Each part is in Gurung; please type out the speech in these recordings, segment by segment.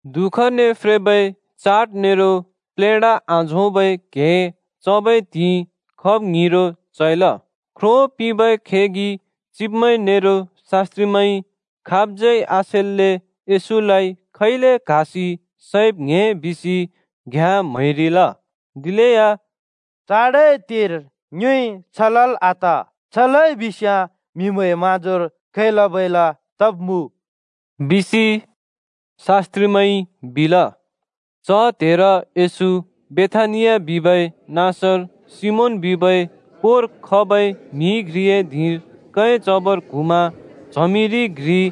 दुःखने फ्रेबै चाड नेरो प्लेढा आझोंबै क्हें चबै त्हिंइ खब ङ्हिरो चैल। ख्रो पिंबै खेगि चिब्मैं नेरो शास्‍त्रिमैंइ खाबज्यै आसेल्‍‍ले येशूलाइ खैले क्हासि सैब् ङ्‍हे बिसि घ्‍याँ म्‍हैरिल। दिलेया “चाडए त्हेर ङ्योइ छ लल् आत। छ लइ बिस्याँ म्‍हिमैंए म्‍हाँजोर खैलाबैला तब्मुँ बिसि,” शास्त्रिमैंइ बिल। च त्हेर येशू बेथानिया बिबै नाँसर सिमोन बिबै कोर खबै म्‍हि घ्रिए धिंर कैं चबर क्हुँमा च्हमिरि घ्रिइ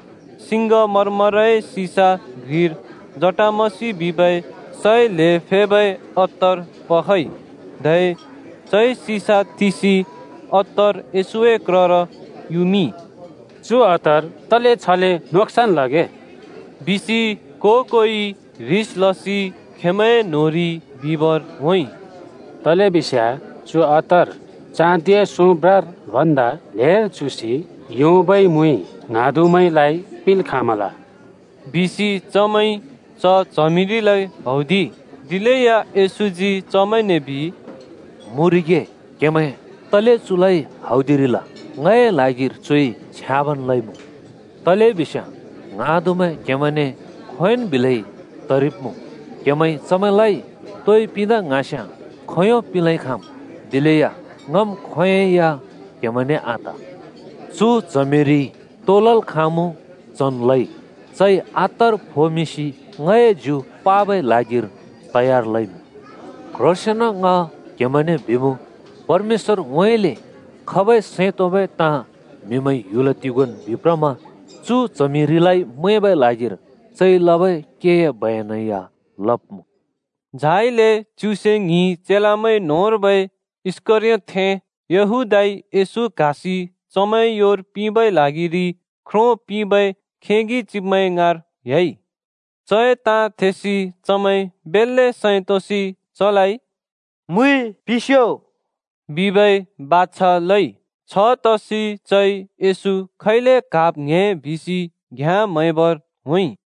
सिङ्गमरमरए सिसा घ्रिर जटामसि बिबै सै ल्हें फेबै अत्तर पखइ। धै चइ सिसा तिसि येशूए क्रर अत्तर युमिंइ। “चु अत्तर तले छले नोक्सन लगे? बिसि को-कोइ ह्रिस लसि खेंमैंए न्होंरि बिबर होंइ। तलेबिस्याँ चु अत्तर चाँदिए सोंब्रार भन्दा ल्हेर चुँसि योंबै मुइ ङ्हाँदु‍मैंलाइ पिंल् खाँमल,” बिसि चमैंइ च च्हमिरिलाइ हौदिइ। दिलेया येशूजी चमैंने बिइ, “मुँरिगे! क्हेमैं तले चुलाइ हौदिरिल? ङए ल्हागिर चुइ छ्याँबन् लइमुँ। तलेबिस्याँ ङ्हाँदुमैं क्‍हेमैंने खोंयोंन् बिलै तरिब्‍मुँ। क्‍हेमैंइ चमैंलाइ तोइ पिंदा ङ्हाँस्‍याँ खोंयों पिंलेन् खाँम्। दिलेया ङम् खोंयोंइ या क्‍हेमैंने आत। चु च्हमिरिइ तो लल् खाँमुँ चन् लइ। चइ अत्तर फोमिंसि ङए ज्यु पाबै ल्हागिर तयार लइमुँ। क्ह्रोंसेंन ङ क्हेमैंने बिमुँ, परमेश्‍वरउँइँले खबै सैं तोंबै ताँ म्हिमैंइ ह्‍युल तिगोंन् बिप्रमा चु च्हमिरिलाइ मैंबै ल्हागिर चइ लबै केए बयनै या लब्‍मुँ।” झाइले च्युसे ङ्हिं चेलामैं न्‍होंर्बै इस्‍करयोतथें यहूदाइ येशू क्हासि चमैंए योर पिंबै ल्हागिरि ख्रो पिंबै खेगि चिब्मैं ङाँर ह्‍याइ। चए ताँ थेसि चमैं बेल्‍ले सैं तोंसि चलाइ “मुइ पिंस्‍यो” बिबै बाछा लइ। छतसि चइ येशू खैले क्हाब् ङ्‍हे बिसि घ्याँ म्हैबर होंइ।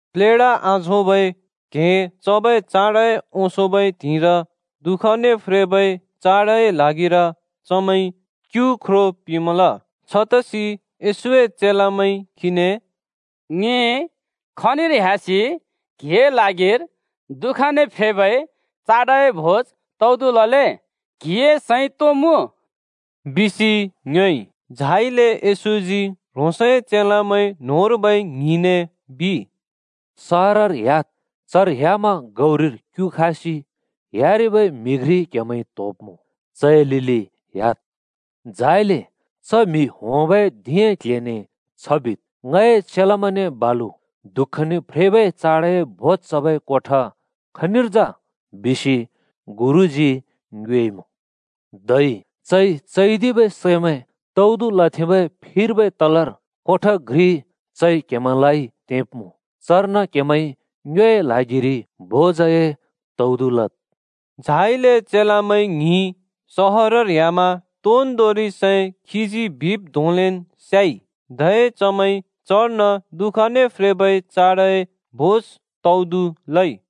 प्लेढा आझोंबै क्हें चबै चाडए ओंसोंबै त्हिंइर दुःखने फ्रेबै चाडए ल्हागिर चमैंइ क्‍यु ख्रो पिंमल। छतसि येशूए चेलामैंइ “ङि खनिर ह्‍यासि क्हिए ल्हागिर दुःखने फ्रेबै चाडए भोज तौदु लले? क्‍हिए सैं तो मुँ? बिसि,” खीने ङ्योएइ। झाइले येशूजी ह्रोंसए चेलामैं न्‍होंर्बै ङ्हिंने बिइ “सहरर ह्‍याद्, चर ह्‍यामा गौरिर क्‍यु खासि ह्‍यारिबै म्हि घ्रि क्हेमैंइ त्होब्‍मुँ। चए लिलि ह्‍याद्। झाइले च म्‍हि होंबै धिंए क्‍ल्‍हेने छ बिद्, ‘ङए चेलामैंने बालु दुःखने फ्रेबै चाडए भोज चबै कोठा खनिर जा? बिसि गुरुजी ङ्योएइमुँ।’ छबिमा चैदिबै सैमैं तौदु लथेंबै फिर्बै तलर कोठा घ्रि चइ क्‍हेमैंलाइ तेंब्‍मुँ। चर्न क्‍हेमैंइ ङ्योए ल्हागिरि भोज तौदु लद्।” झाइले चेलामैं ङ्हिं सहरर ह्‍यामा तोन्दोंरि सै खीजी बिब् धोंलेन् स्याइ, धै चमैंइ चर्न दुःखने फ्रेबै चाडए भोज तौदु लइ।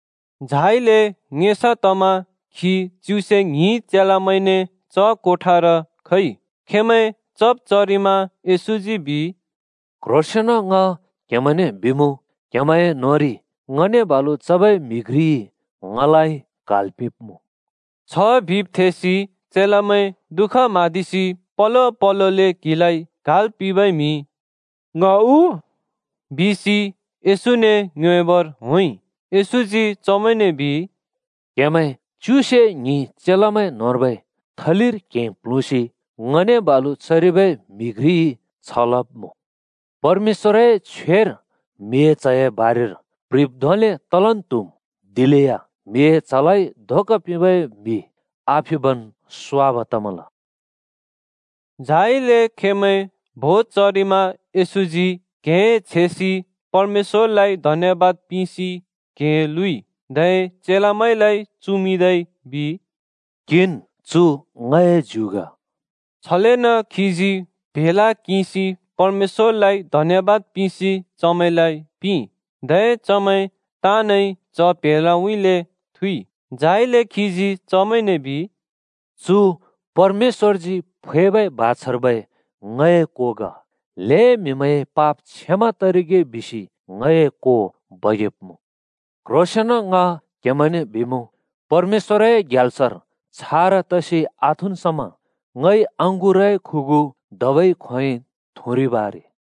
झाइले ङेसा तमा खी च्युसे ङ्हिं चेलामैंने च कोठार खइ। खेंमैं चब् चरिमा येशूजी बिइ, “क्ह्रोंसेंन ङ क्हेमैंने बिमुँ, क्‍हेमैंए न्‍होंरि ङने बालु चबै म्‍हि घ्रिइ ङलाइ क्हाल् पिंब्मुँ।” छ बिब् थेसि चेलामैं दुःख म्हाँदिसि पलो पलोले क्हिलाइ क्हाल् पिंबै म्हि “ङ उ?” बिसि येशूने ङ्योएबर होंइ। येशूजी चमैंने बिइ, “क्हेमैं च्युसे ङ्हिं चेलामैं न्‍होंर्बै थलिर क्हें प्ल्हुँसि ङने बालु चरिबै म्हि घ्रिइ छ लब्मुँ। परमेश्‍वरए छ्वेर म्हिए च्हए बारेर प्ह्रिब् धोंले तलन् त्‍हुम्। दिलेया म्हिए च्हलाइ धोका पिंबै म्हि आफिबन् स्वाब तमल।” झाइले खेंमैं भोज चरिमा येशूजी क्‍हें छेसि परमेश्‍वरलाइ धन्यबाद पिंसि क्हें लुँइ, धै चेलामैंलाइ चुमिंदै बिइ, “किंन्, चु ङए ज्यु ग।” छलेन खीजी प्‍हेला किंसि परमेश्‍वरलाइ धन्‍यबाद पिंसि चमैंलाइ पिंइ, धै चमैं ताँनइ च प्हेलाउँइँले थुँइ। झाइले खीजी चमैंने बिइ, “चु परमेश्‍वरजी फैबै बाछार्बै ङए को ग। ल्‍हें म्‍हिमैंए पाप क्षमा तरिगे बिसि ङए को बगेब्मुँ। क्ह्रोंसेंन ङ क्हेमैंने बिमुँ, परमेश्‍वरए ग्याल्सर छारा तरिकाले आथुँन् समा ङइ अँगुरए खुगु धबै खोंयोंइ थुँरिब् आरे।”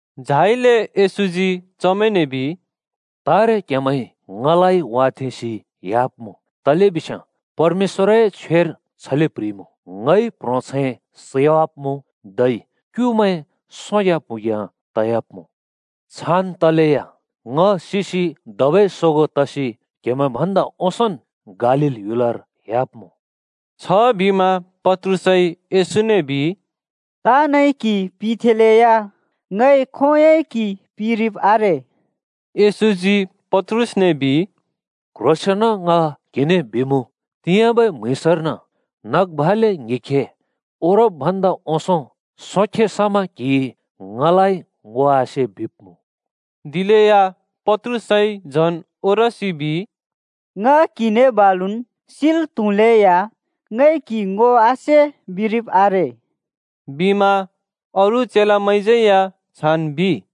झाइले येशूजी चमैंने बिइ, “तारे क्‍हेमैंइ ङलाइ वाथेंसि ह्‍याब्‍मुँ तलेबिस्याँ परमेश्‍वरए छ्वेर छले प्‍ह्रिइमुँ, ‘ङइ प्‍ह्रोंछैं सैवाब्‍मुँ, धै क्‍युमैं सोग्याँ प्हुँग्या तयाब्‍मुँ।’ छान् तलेया ङ सिसि धबै सोगों तसि क्‍हेमैं भन्दा ओंसोंन् गालील ह्‍युलर ह्‍याब्‍मुँ।” छबिमा पत्रुसइ येशूने बिइ, “ताँनइ क्‍हि पिथेंलेया ङइ खोंयोंइ क्हि पिरिब् आरे।” येशूजी पत्रुसने बिइ, “क्ह्रोंसेंन ङ क्हिने बिमुँ, तिंयाँबै म्‍हुँइँसर्न नग भाले ङ्हिखे ओरब् ओंसों सोंखे समा क्‍हिइ ङलाइ ङो आसे बिब्मुँ।” दिलेया पत्रुसइ झन् ओरसि बिइ, “ङ क्‍हिने बालुन् सिल् त्‍हुलेया ङइ क्‍हि ङो आसे बिरिब आरे!” बिमा अरू चेलामैंज्‍यै या छान् बिइ।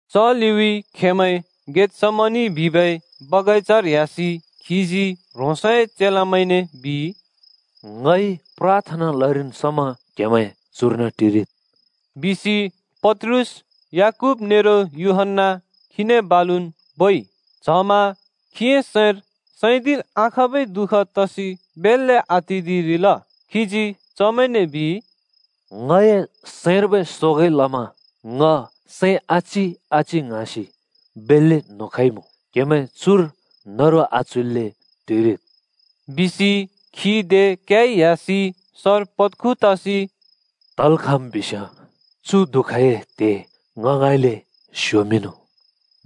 च लिउँइँ खेंमैं गेतसमनि बिबै बगैंचार ह्‍यासि खीजी ह्रोंसए चेलामैंने बिइ, “ङइ प्राथना लरिन् समा क्‍हेमैं चुर्न टिरिद् ओ।” बिसि पत्रुस, याकूब नेरो यूहन्‍ना खीने बालुन् बोइ। च्हमा खीए सैंर सैदिल् आखाँबै दुःख तसि बेल्‍ले आतिदिरिल। खीजी चमैंने बिइ, “ङए सैंर्बै शोकइ लमा ङए सैं आचि-आचि ङ्हाँसि बेल्‍ले न्हुँ खइमुँ। क्‍हेमैं चुर न्हरु आच्हुइल्‍ले टिरिद्।” बिसि खी दे क्‍याइ ह्‍यासि सर पत्खु तसि “तल् खाँम् बिस्‍याँ चु दुःखए त्हे ङ ङाँइँले स्योमिंनु,”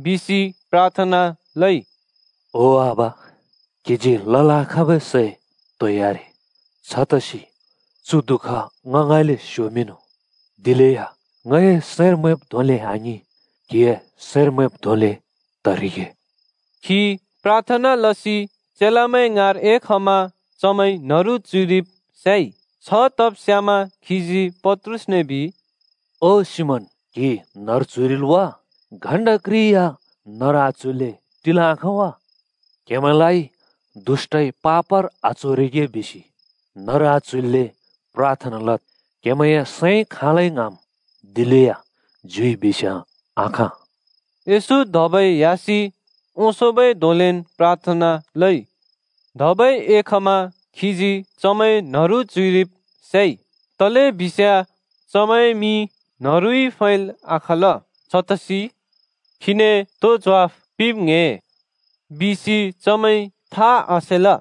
बिसि प्राथना लइ। “ओ आबा, क्‍हिजी लल् आखाँबै सै तोइ आरे। छतसि चु दुःख ङ ङाँइँले स्‍योमिंनु। दिलेया ङए सैंर मैंब् धोंले आङिं, क्‍हिए सैंर मैंब् धोंले तरिगे।” खी प्राथना लसि चेलामैं ङाँर एखमा चमैं न्‍हरु च्‍हुइरिब् स्याइ। छतब् स्यामा खीजी पत्रुसने बिइ, “ओ सिमोन, क्‍हि न्‍हरु च्‍हुइरिल् वा? घण्टा घ्रि या न्हरु आच्हुइल्‍ले टिल् आखाँ वा? दुष्‍टइ क्‍हेमैंलाइ पापर आच्होरिगे बिसि न्हरु आच्हुइल्‍ले प्राथना लद्। क्‍हेमैंए सैंइ खाँलै ङ्हाँम्, दिलेया ज्युइ बिस्याँ आखाँ।” येशू धबै ह्‍यासि ओंसोंबै धोंलेन् प्राथना लइ। धबै एखमा खीजी चमैं न्‍हरु च्‍हुइरिब् स्‍याइ। तलेबिस्याँ चमैंए मि न्हरुइ फैल् आखाँल। छतसि “खीने तो ज्वाफ पिंब् ङ्‍हे?” बिसि चमैंइ था आसेल।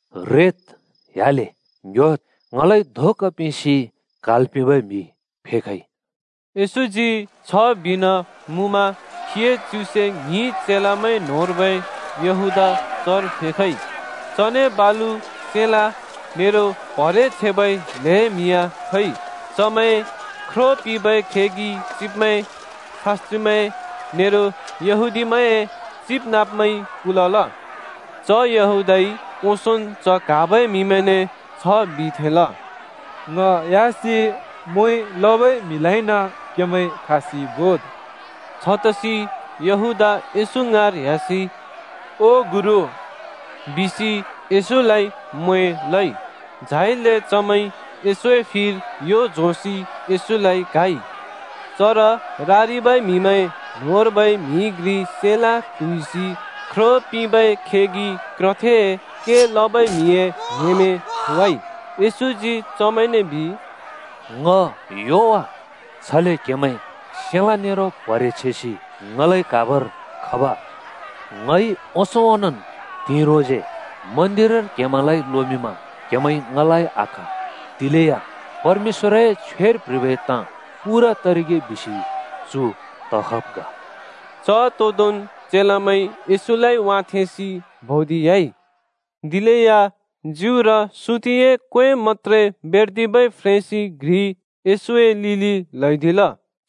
रेद्, ह्‍याले। ङ्‌ह्‍योद्! ङलाइ धोका पिंसि क्हाल् पिंबै म्‍हि फेखइ।” येशूजी छ बिइन मुँमा खीए च्युसे ङ्हिं चेलामैं न्‍होंर्बै यहूदा चर फेखइ। चने बालु सेलाँ (तरवार) नेरो प्‍हरे छेबै ल्हें म्हि या खइ। चमैं ख्रो पिंबै खेगि चिब्मैं, शास्‍त्रिमैं, नेरो यहूदीमैंए चिबनाँब्मैंइ कुलल। च यहूदाइ ओंसोंन् च क्‍हाबै म्‍हिमैंने छ बिथेंल, “ङ ह्‍यासि म्वें लबै म्हिलाइन क्हेमैंइ क्‍हासि बोद्।” छतसि यहूदा येशू ङाँर ह्‍यासि “ओ गुरु” बिसि येशूलाइ म्वें लइ। झाइले चमैंइ येशूए फिर यो झोंसि येशूलाइ क्‍हाइ। चर रारिबै म्‍हिमैं न्‍होंर्बै म्हि घ्रिइ सेलाँ ट्हुइसि ख्रो पिंबै खेगि क्रथेए के लबै म्हिए न्‍हेमें थोवाइ। येशूजी चमैंने बिइ, “ङ ह्‍यो वा? छले क्‍हेमैं सेलाँ नेरो प्हरे छेसि ङलाइ क्हाबर खब? ङइ ओंसों ओंनोंन् त्हिंइ ह्रोंसे मन्दिरर क्‍हेमैंलाइ लोमिंमा क्‍हेमैंइ ङलाइ आक्‍हा। दिलेया परमेश्‍वरए छ्वेर प्‍ह्रिबै ताँ पूरा तरिगे बिसि चु तखब् ग।” च तोदोंन् चेलामैं येशूलाइ वाथेंसि भौदिह्‍याइ। दिलेया ज्युर सुतिए क्वें मत्‍त्रे बेर्दिबै फ्रेंसि घ्रि येशूए लिलि ल्हैदिल।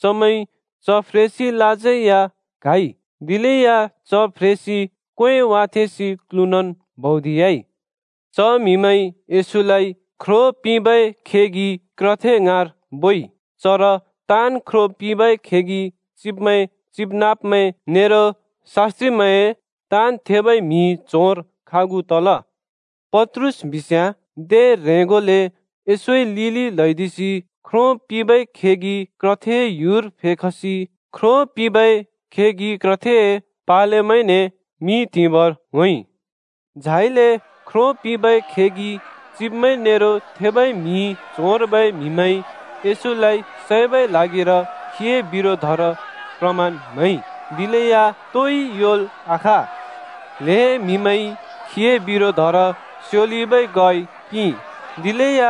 चमैंइ च फ्रेंसिलाज्यै या क्‍हाइ। दिलेया च फ्रेंसि क्‍वें वाथेंसि क्‍लुँनन् भौदिह्‍याइ। च म्हिमैंइ येशूलाइ ख्रो पिंबै खेगि क्रथे ङाँर बोइ। चर ताँन् ख्रो पिंबै खेगि चिब्मैं, चिबनाँब्मैं नेरो शास्‍त्रिमैं ताँन् थेबै म्हि च्होंर खागु तल। पत्रुस बिस्‍याँ दे ह्रेंगोले येशूए लिलि ल्‍हैदिसि ख्रो पिंबै खेगि क्रथेए ह्‍युर फेखसि ख्रो पिंबै खेगि क्रथेए पालेमैंने मि त्‍हिबर होंइ। झाइले ख्रो पिंबै खेगि चिब्मैं नेरो थेबै म्हि च्होंर्बै म्हिमैंइ येशूलाइ सैबै ल्हागिर खीए बिरोधर प्रमाण म्‍हैइ, दिलेया तोइ योंल् आखाँ। ल्‍हें म्‍हिमैंइ खीए बिरोधर स्योलिबै ग्वाइ पिंइ, दिलेया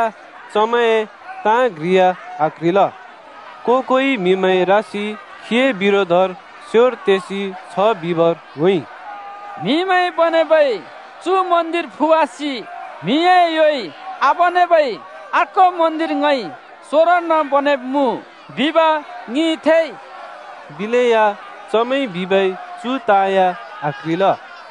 चमैंए ताँ घ्रि या आक्‍ह्रिल। को-कोइ म्‍हिमैं रासि खीए बिरोधर स्‍योर तेसि छ बिबर होंइ, “‘म्‍हिमैंइ बनेबै चु मन्दिर फुवासि म्‍हिए योइ आबनेबै अर्को मन्दिर ङइ सोंरोर्न बनेब्‍मुँ,’ बिब ङिइ थेइ।” दिलेया चमैंइ बिबै चु ताँ या आक्‍ह्रिल।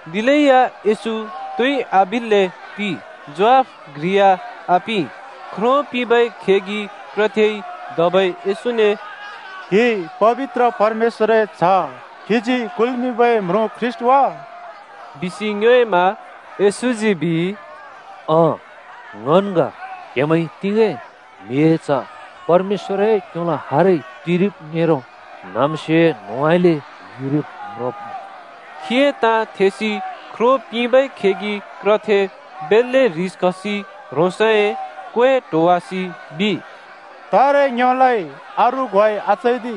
दिलेया येशू तोइ आबिल्‍ले टिइ, ज्वाफ घ्रि या आपिं। ख्रो पिंबै खेगि क्रथेइ धबै येशूने “क्‍हि पबित्र परमेश्‍वरए च्‍ह खीजी कुल्मिंबै म्रुँ ख्रीष्‍ट वा?” बिसि ङ्योएइ। येशूजी “अँ ङन् ग बिइ, क्‍हेमैंइ तिगें म्हिए च्ह परमेश्‍वरए क्‍योलो हार टिरिब् नेरो न्हाँम्स्योए न्होंउँइँले युरिब् म्रोंब्‍मुँ।” खीए ताँ थेसि ख्रो पिंबै खेगि क्रथे बेल्‍ले ह्रिस खसि ह्रोंसए क्‍वें ट्होवासि बिइ, “तारे ङ्योलाइ अरू ग्वाइ आचैदि।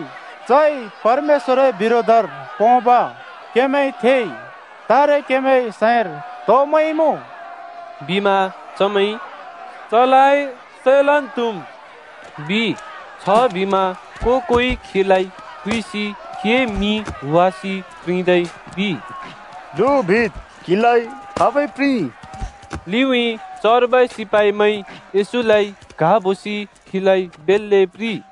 चइ परमेश्‍वरए बिरोधर पोंब क्‍हेमैंइ थेइ। तारे क्‍हेमैंए सैंर तो मैंमुँ?” बिमा चमैंइ “चलाइ सैलन् त्हुम्,” बिइ। छबिमा को-कोइ खीलाइ थुइसि खीए मि हुवासि प्रिंदै बिइ, “ल्हु, बिद्, खाबइ क्‍हिलाइ प्रिंइ?” लिउँइँ चर्बै सिपाइमैंइ येशूलाइ क्हाबोसि खीलाइ बेल्‍ले प्रिंइ।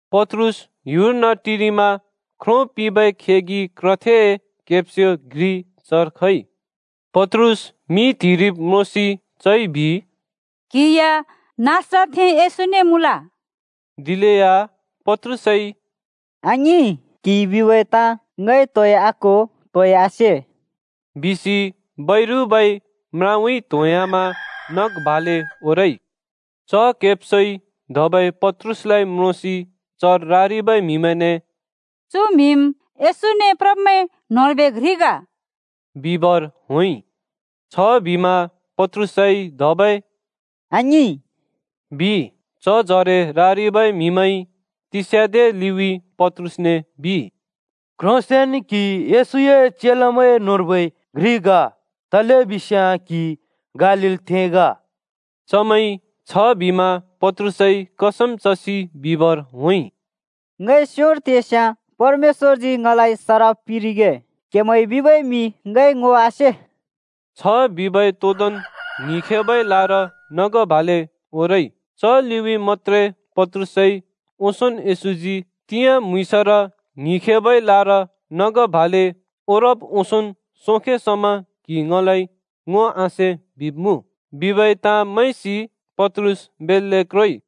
पत्रुस ह्‍युर्न टिरिमा ख्रो पिंबै खेगि क्रथेए केब्स्यो घ्रि चर खइ। पत्रुस मि त्‍हिरिब म्रोंसि चइ बिइ, “क्‍हि या नासरतथें येशूने मुँल।” दिलेया पत्रुसइ “आङिं! क्‍हिइ बिबै ताँ ङइ तोइ आक्हो, तोइ आसे,” बिसि बैरुबै म्राउँइँ त्होंह्‍यामा नग भाले ओरइ। च केब्स्योइ धबै पत्रुसलाइ म्रोंसि चर रारिबै म्‍हिमैंने “चु म्‍हिम् येशूने प्रब्मैं न्होंर्बै घ्रि ग,” बिबर होंइ। छबिमा पत्रुसइ धबै “आङिं!” बिइ। चजरे रारिबै म्‍हिमैंइ तिस्याँदे लिउँइँ पत्रुसने बिइ, “क्‍ह्रोंसेंन क्‍हि येशूए चेलामैं न्होंर्बै घ्रि ग, तलेबिस्याँ क्‍हि गालीलथें ग।” चमैंइ छबिमा पत्रुसइ कसम चसि बिबर होंइ, “ङइ स्‍योर तेस्‍याँ परमेश्‍वरजी ङलाइ सराप पिंरिगे! क्हेमैंइ बिबै म्‍हि ङइ ङो आसे।” छ बिबै तोदोंन् ङ्हिखेबै लार नग भाले ओरइ। च लिउँइँ मत्‍त्रे पत्रुसइ ओंसोंन् येशूजी “तिंयाँ म्‍हुँइँसर ङ्हिखेबै लार नग भाले ओरब् ओंसोंन् सोंखे समा क्हिइ ङलाइ ङो आसे बिब्‍मुँ,” बिबै ताँ मैंसि पत्रुस बेल्‍ले क्रोइ।